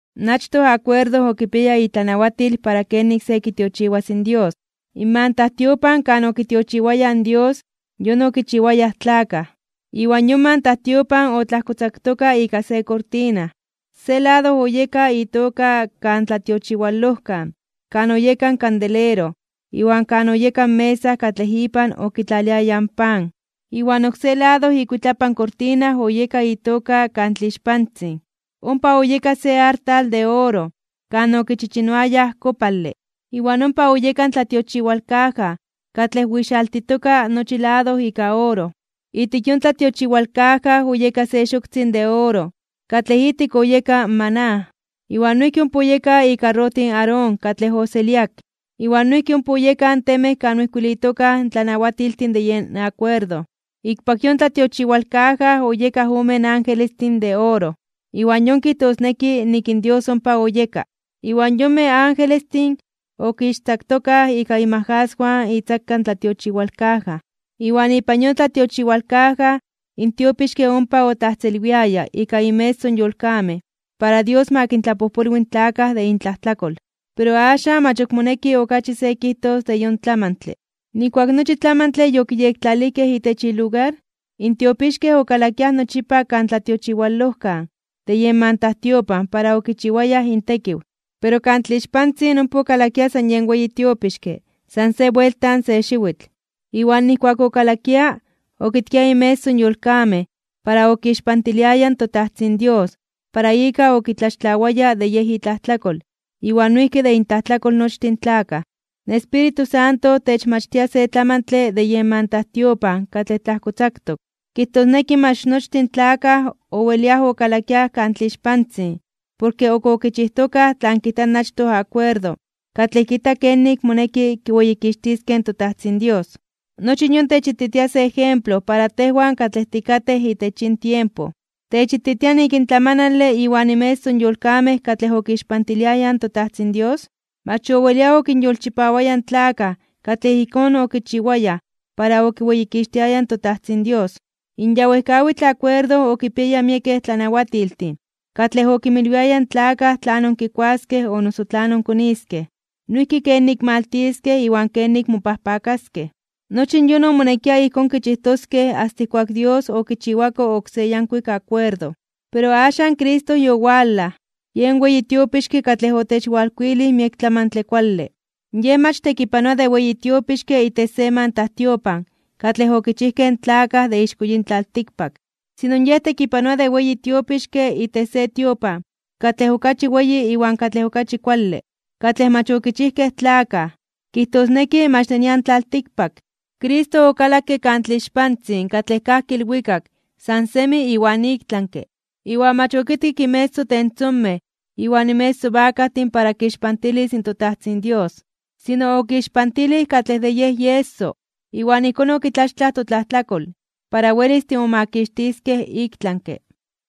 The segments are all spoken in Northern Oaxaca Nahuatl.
In achtoj akuerdo okipiaya itlanawatil (irreglamento) para kenik se kitiochiwas in Dios. In mantajtiopan kan okitiochiwayaj in Dios yon okichiwayaj in tlakaj. Iwan yon mantajtiopan otlajkotzaktoka ika se kortina, se lado oyeka itoka Kan Tlatiochiwalojkan kan oyeka in kandelero iwan kan oyeka in mesa katlej ipan okitlaliayaj in pan. Iwan oksé lado ikuitlapan kortina oyeka itoka Kan Tlixpantzin. Ompa oyeka se artal de oro kan okichichinoayaj kopale, iwan ompa oyeka in tlatiochiwalkaja katlej oixaltitoka nochi lado ika oro. Ijtik yon tlatiochiwalkaja oyeka se xoktzin de oro katlej ijtik oyeka in maná, iwan noijki ompa oyeka ikarrotij in Aarón katlej oseliak, iwan noijki ompa oyekaj in temej kan oijkuilitokaj in tlanawatiltin de yen akuerdo. Ikpak yon tlatiochiwalkaja oyekaj omen angelestin de oro, iwan yon kijtosneki nik in Dios ompa oyeka, iwan yonmej angelestin okixtzaktokaj ika inmajaswan itzaka in tlatiochiwalkaja. Iwan ipan yon tlatiochiwalkaja in tiopixke ompa otlajtzelwiaya ika inmeso in yolkamej para Dios ma kintlapojpolwi in tlakaj de intlajtlakol. Pero axan mach moneki okachi se kijtos de yon tlamantle. Nijkuak nochi tlamantle yokiyektlalijkej itech ilugar, in tiopixkej okalakiaj nochipa Kan Tlatiochiwalojkan de yen mantajtiopan para okichiwayaj intekiw. Pero Kan Tlixpantzin ompa okalakia san yen weyi tiopixke san se buelta se xiwitl. Iwan nijkuak okalakia okitkia inmeso in yolkamej para okixpantiliaya in toTajtzin Dios para ika okitlaxtlawaya de yej itlajtlakol iwan noijki de intlajtlakol nochtin tlakaj. In Espíritu Santo techmachtia se tlamantle de yen mantajtiopan katlej tlajkotzaktok. Kijtosneki mach nochtin tlakaj oweliaj okalakiaj Kan Tlixpantzin porke ok okichijtokaj tlan kijta in achtoj akuerdo katlej kijta kenik moneki kiweyikixtiskej in toTajtzin Dios. Nochi yon techititia se ejemplo para tejwan katlej tikatej itech yin tiempo. Techititia nik in tlamanale iwan inmeso in yolkamej katlej okixpantiliayaj in toTajtzin Dios, mach owelia okinyolchipawaya in tlakaj katlej ijkón okichiwayaj para okiweyikixtiayaj in toTajtzin Dios. In ya wejkawitl akuerdo okinpiaya miekej tlanawatiltin katlej okinmilwiaya in tlakaj tlanon kikuaskej o noso tlanon koniskej, noijki kenik maltiskej iwan kenik mopajpakaskej. Nochi yon omonekia ijkón kichijtoskej asta ijkuak Dios okichiwako oksé yankuik akuerdo. Pero axan Cristo yowalaj, yen weyi tiopixke katlej otechwalkuilij miek tlamantle kuale. Yej mach tekipanoa de weyi tiopixke itech se mantajtiopan katlej okichijkej in tlakaj ixko yin tlaltikpak, sino Yej tekipanoa de weyi tiopixke itech se tiopan katlej okachi weyi iwan katlej okachi kuale, katlej mach okichijkej in tlakaj, kijtosneki mach de nian tlaltikpak. Cristo okalakke Kan Tlixpantzin katlej kajki ilwikak san semi iwan iktlanke (ik tlami), iwan mach okitkik inmeso tentzomej iwan inmeso bakajtin para kixpantilis in toTajtzin Dios, sino okixpantilij katlej de Yej ieso, iwan ijkón okitlaxtlaj totlajtlakol para welis timomakixtiskej iktlanke.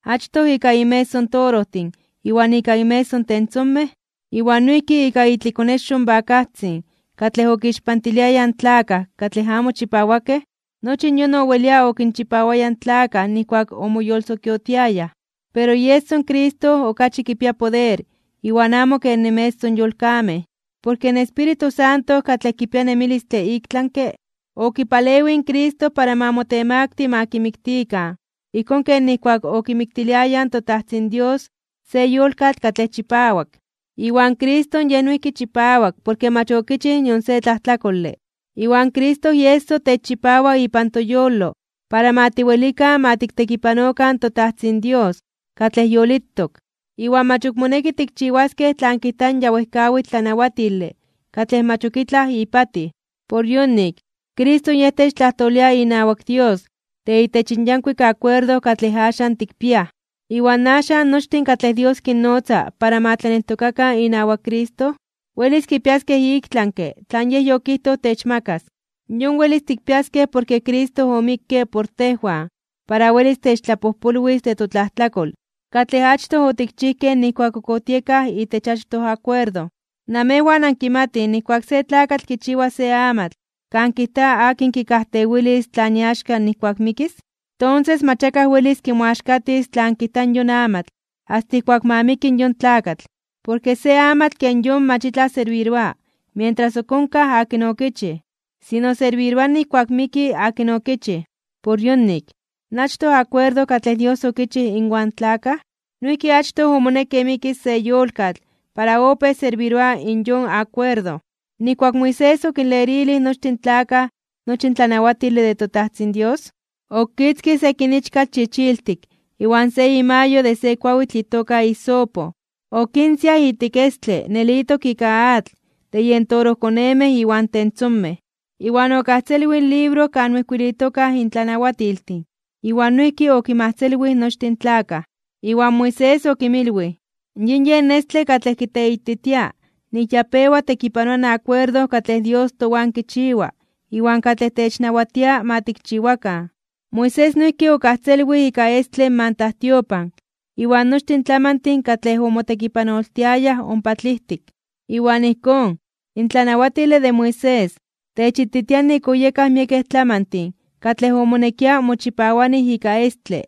Achtoj ika inmeso torojtin iwan ika inmeso tentzomej, iwan noijki ika itlikonexo in bakajtzin katlej okinpixiliayaj in tlakaj katlej amo chipawakej, nochi yon owelia okinchipawaya in tlakaj nijkuak omoyolsokiotiayaj. Pero ieso in Cristo okachi kipia poder iwan amo ken inmeso in yolkamej. Porke in Espíritu Santo katlej kipia nemilistle iktlanke (ik tlami), okipalewij in Cristo para ma motemakti (motemaktili) ma kimiktikan ijkón ken nijkuak okimiktiliayaj in toTajtzin Dios se yolkatl katlej chipawak. Iwan Cristo Yej noijki chipawak porke mach okichij nion se tlajtlakole. Iwan Cristo ieso techchipawa ipan toyolo para ma tiwelikan ma tiktekipanokan toTajtzin Dios katlej yolitok, iwan mach ok moneki tikchiwaskej tlan kijta in ya wejkawitl tlanawatile katlej mach ok itlaj ipatij. Por yonik, Cristo yen techtlajtolia inawak Dios de itech in yankuik akuerdo katlej axan tikpiaj. Iwan axan nochtin katlej Dios kinnotza para ma tlaneltokakan inawak Cristo, welis kipiaskej iktlanke (ik tlami) tlan Yej yokijtoj techmakas. Yon welis tikpiaskej porke Cristo omikke por tejwan para welis techtlapojpolwis de totlajtlakol katlej achtoj otikchijkej nijkuak ok otiekaj itech achtoj akuerdo. Namejwan ankimatij nijkuak se tlakatl kichiwa se amatl kan kijta akin kikajtewilis tlan iaxka nijkuak mikis, tonses mach akaj welis kimoaxkatis tlan kijta yon amatl asta ijkuak ma miki yon tlakatl. Porke se amatl ken yon mach itlaj serbiroa mientras ok onkaj akin okichij, sino serbiroa nijkuak miki akin okichij. Por yonik, in achtoj akuerdo katlej Dios okichij inwan tlakaj, noijki achtoj omonekke mikis se yolkatl para opéj serbiroa in yon akuerdo. Nijkuak Moisés okinlerilij nochtin tlakaj nochi in tlanawatile de toTajtzin Dios, okitzkij sekin ichkatl chichiltik iwan se imayo de se kuawitl itoka hisopo, okinsiaj ijtik estle nelitok ika atl de yen torojkonemej iwan tentzomej, iwan okajtzelwij in libro kan oijkuilitokaj in tlanawatiltin iwan noijki okinmajtzelwij nochtin tlakaj. Iwan Moisés okinmilwij: “Yin yen estle katlej kiteititia nik ya pewa tekipanoa in akuerdo katlej Dios towan kichiwa iwan katlej technawatia ma tikchiwakan.” Moisés noijki okajtzelwij ika estle in mantajtiopan iwan nochtin tlamantin katlej omotekipanoltiayaj ompa tlijtik. Iwan ijkón, in tlanawatile de Moisés, techititia nik oyekaj miekej tlamantin katlej omonekia mochipawanij ika estle.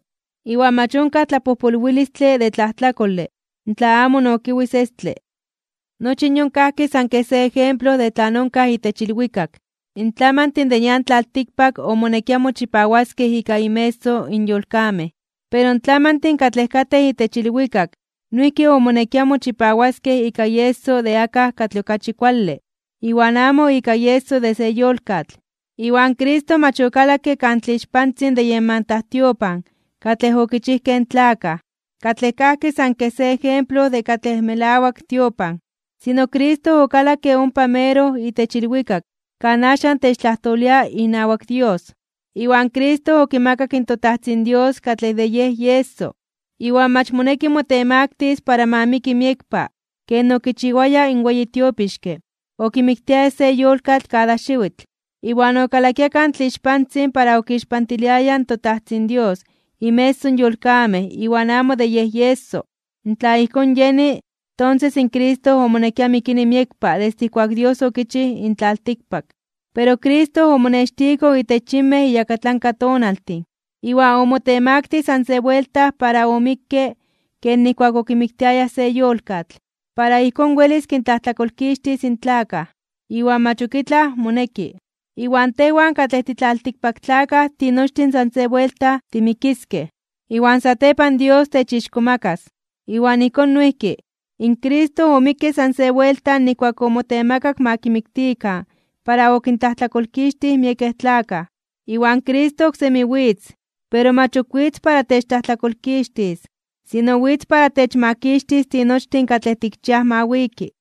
Iwan mach onkaj tlapojpolwilistle de tlajtlakole tla amo nokiwis estle. Nochi yon kajki san kej se ejemplo de tlan onkaj itech ilwikak. In tlamantin de nian tlaltikpak omonekia mochipawaskej ika inmeso in yolkamej. Pero in tlamantin katlej katej itech ilwikak noijki omonekia mochipawaskej ika ieso de akaj katlej okachi kuale, iwan amo ika ieso de se yolkatl. Iwan Cristo mach okalakke Kan Tlixpantzin de yen mantajtiopan katlej okichijkej in tlakaj, katlej kajki san kej se ejemplo de katlej melawak tiopan. Sino Cristo okalakke ompa meroj itech ilwikak kan axan techtlajtolia inawak Dios. Iwan Cristo okimakak in toTajtzin Dios katlej de Yej ieso, iwan mach moneki motemaktis (motemaktilis) para ma miki miekpa ken okichiwaya in weyi tiopixke okimiktiaya se yolkatl kada xiwitl, iwan okalakia Kan Tlixpantzin para okixpantiliaya in toTajtzin Dios inmeso in yolkamej iwan amo de yen ieso. Tla ijkón yeni, tonses in Cristo omonekia mikini miekpa desde ijkuak Dios okichij in tlaltikpak. Pero Cristo omonextiko itech yinmej iyakatlanka tonaltin, iwan omotemaktij san se buelta para omikke ken nijkuak okimiktiayaj se yolkatl, para ijkón welis kintlajtlakolkixtis in tlakaj, iwan mach ok itlaj moneki. Iwan tejwan katlej titlaltikpaktlakaj tinochtin san se buelta timikiskej, iwan satepan Dios techixkomakas (techtzonmanas). Iwan ijkón noijki, in Cristo omikke san se buelta nijkuak omotemakak ma kimiktikan para okintlajtlakolkixtij miekej tlakaj. Iwan Cristo oksemi witz, pero mach ok witz para techtlajtlakolkixtis, sino witz para techmakixtis tinochtin katlej tikchiaj ma wiki.